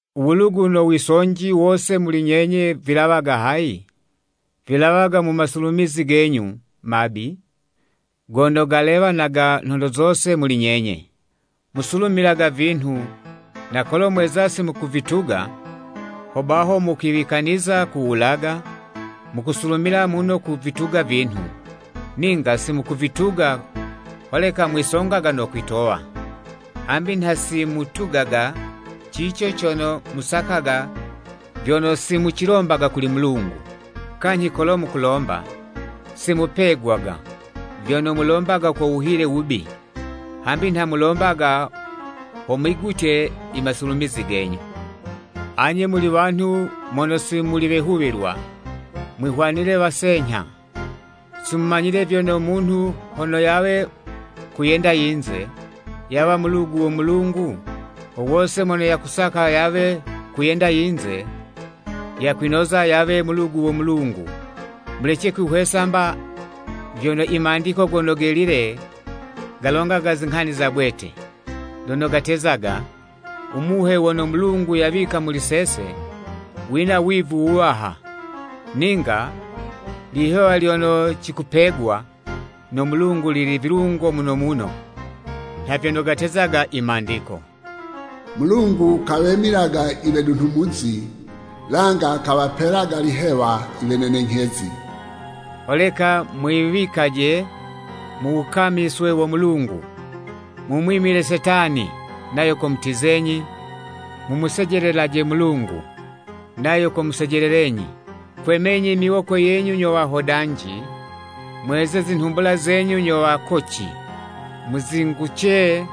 U wulugu no wisonji wose muli nyenye vilawaga hayi? Vilawaga mu masulumizi genyu mabi, gono galewanaga nhondo zose muli nyenye. Musulumilaga vinhu, na kolo mweza simukuvituga, hobaho mukwiwikaniza kuwulaga, mukusulumila muno kuvituga vinhu, ninga simukuvituga, holeka mwisongaga no kwitowa. Hambi nha simutugaga cico cono musakaga vyono simucilombaga kuli Mulungu. Kanyhi kolo mukulomba simupegwaga, vyono mulombaga ko wuhile wubi, hambi nha mulombaga ho mwigutye imasulumizi genyu. Anye muli wanhu mono si muli wehuwilwa, mwihwanile wasenyha. Simumanyile vyono munhu hono yawe kuyenda yinze, yawa mulugu wo Mulungu? Wo wose mono yakusaka yawe kuyenda yinze, yakwinoza yawe mulugu wo Mulungu. Mulece kwihwesa mba vyono i Mandiko Gono Gelile galongaga zinghani za bwete, lono gatezaga, “Umuhe wono Mulungu yawika muli sese, wina wivu wuwaha.” Ninga, lihewa lyono cikupegwa no Mulungu lili vilungo muno muno, nha vyono gatezaga i Mandiko, “Mulungu kawemilaga iwedunhumuzi, langa kawapelaga lihewa iwenenenyhezi.” Holeka mwiwikaje mu wukamiswe wo Mulungu, mumwimile Setani, nayo komutizenyi. Mumusejelelaje Mulungu, nayo komusejelelenyi. Kwemenyi miwoko yenyu nyo wahodanji! Mweze zinhumbula zenyu nyo wakoci! Muzinguce,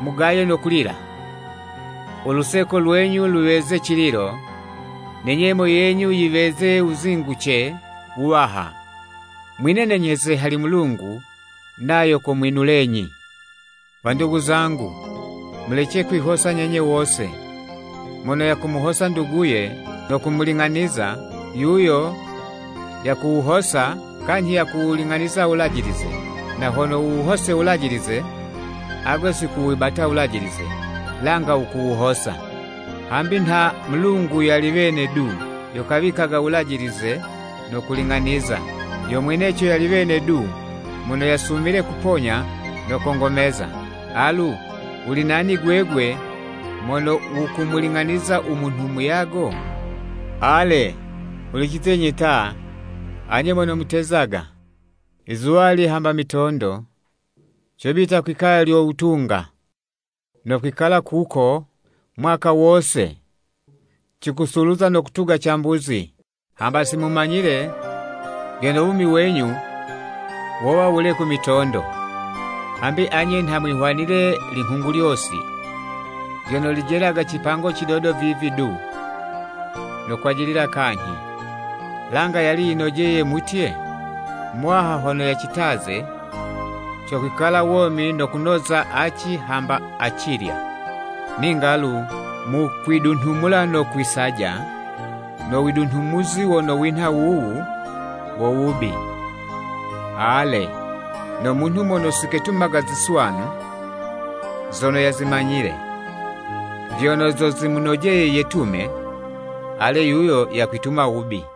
mugaye no kulila, uluseko lwenyu luweze cililo, ne nyemo yenyu yiweze wuzinguce wuwaha. Mwinenenyheze hali Mulungu, nayo komwinulenyi. Wandugu zangu, mulece kwihosa nyenye wose. Mono yakumuhosa nduguye no kumuling'aniza, yuyo, yakuwuhosa kanyhi yakuwuling'aniza Wulajilize. Na hono wuwuhose Wulajilize, agwe siwukuwibata Wulajilize, langa wukuwuhosa. Hambi nha Mulungu yali wene du yo kawikaga wulajilize no kuling'aniza. Yo mweneco yali wene du mono yasumile kuponya no kongomeza. Alu, wuli nani gwegwe mono wukumuling'aniza u munhu muyago? Ale, hulicizenyi ta, anye mono mutezaga, “Izuwali hamba mitondo, cobita kwikaya lyo wutunga, no kwikala kuko mwaka wose cikusuluza no kutuga cambuzi.” Hamba simumanyile vyono wumi wenyu wowa wule ku mitondo! Hambi anye nha mwihwanile linghungulyosi lyono lijelaga cipango cidodo vivi du no kwajilila kanyhi. Langa yali yinojeye mutye, “U Muwaha hono yacitaze cokwikala womi no kunoza aci hamba acilya.” Ninga lu, mukwidunhumula no kwisaja, no widunhumuzi wono winha wuwu wo wubi. Ale, no munhu mono siketumaga ziswanu zono yazimanyile, vyono zo zimunojeye yetume, ale yuyo yakwituma wubi.